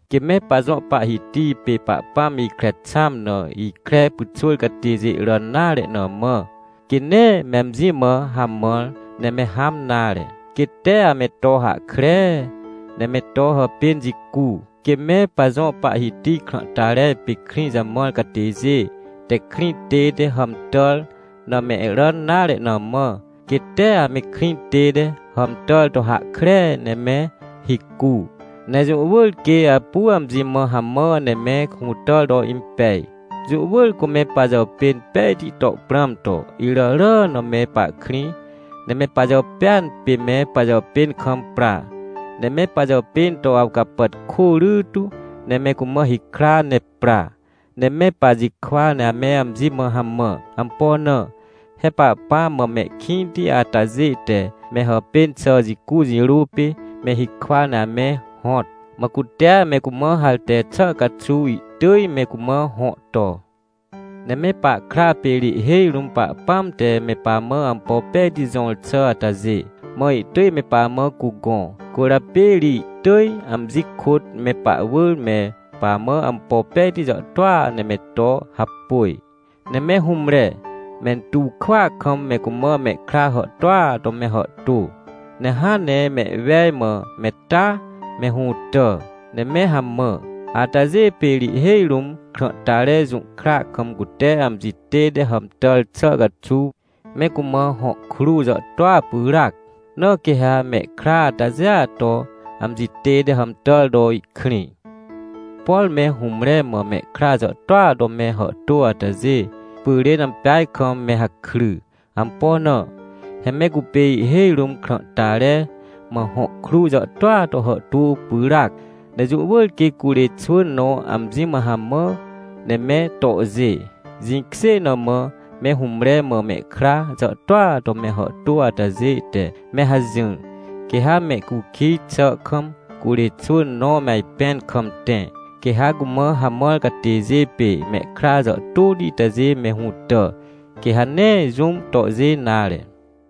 Quê me pajõ Pahhiti pê Pahpãm ikre xãm na ikre pyxwỳr catêjê ràn nare na mã, quê nee me amji mã hamãr, ne me hãm nare, quê tee ame to hahkree, ne me to hàpên jicu. Quê me pajõ Pahhiti krãhtare pê krĩ jamãr catêjê te krĩ tête hàmtàr na mehràn nare na mã, quê tee ame krĩ tête hàmtàr to hahkree ne me hicu. Ne jũ wỳr quê apu amji mã hamã ne me hũtàr to impej. Jũ wỳr cu me pajàpên pejti to prãm to, iràràa na me pahkrĩ, ne me pajàpêan pê me pajàpên kam pra, ne me pajàpên to awcapàtkô rytu ne me cumã hikra ne pra, ne me pajikwa ne ame amji mã hamã. Ampo na? He Pahpãm mã mehkĩnti atajê te me hàpên xà jicu jirô pê me hikwa ne ame hõt. Mã cutea me cumã harte xà caxuw ihtỳj me cumã hõ to. Ne me pahkra pê ri ihhêj rũm Pahpãm te me pamã ampo pejti jõr xà atajê, mã ihtỳj me pamã cugõ. Cwỳrjapê ri ihtỳj amji kôt me pahwỳr me pamã ampo pejti jàhtôa ne me to hapôj. Ne me hũmre, mentuw kwỳa kam me cumã mehkra hàhtôa to me hàhtô. Ne hãn ne mehwej mã me taa me hũtà, ne me hamã. Atajê pê ri ihhêj rũm krãhtare jũhkra kam cute amji tête hàmtàr xà caxuw me cumã hõ kruw jàhtôa pyràac, na quê ha mehkra atajêa to amji tête hàmtàr to ihkrĩ. Por me hũmre mã mehkra jàhtôa to me hàhtô atajê pyrên ampeaj kam me hakry. Ampo na? He me cupê ihhêj rũm krãhtare mã hõ kruw jàhtôa to hàhtô pyràac. Ne jũ wỳr quê curê xwỳn nõ amji mã hamã ne me tohjê. Jĩkjê na mã me hũmre mã mehkra jàhtôa to me hàhtô atajê te me hajỹr. Quê ha mehcukij xà kam curê xwỳn nõ me ajpẽn kam tẽ, quê ha cumã hamãr catêjê pê mehkra jàhtôti itajê me hũtà, quê ha nee jũm tohjê nare.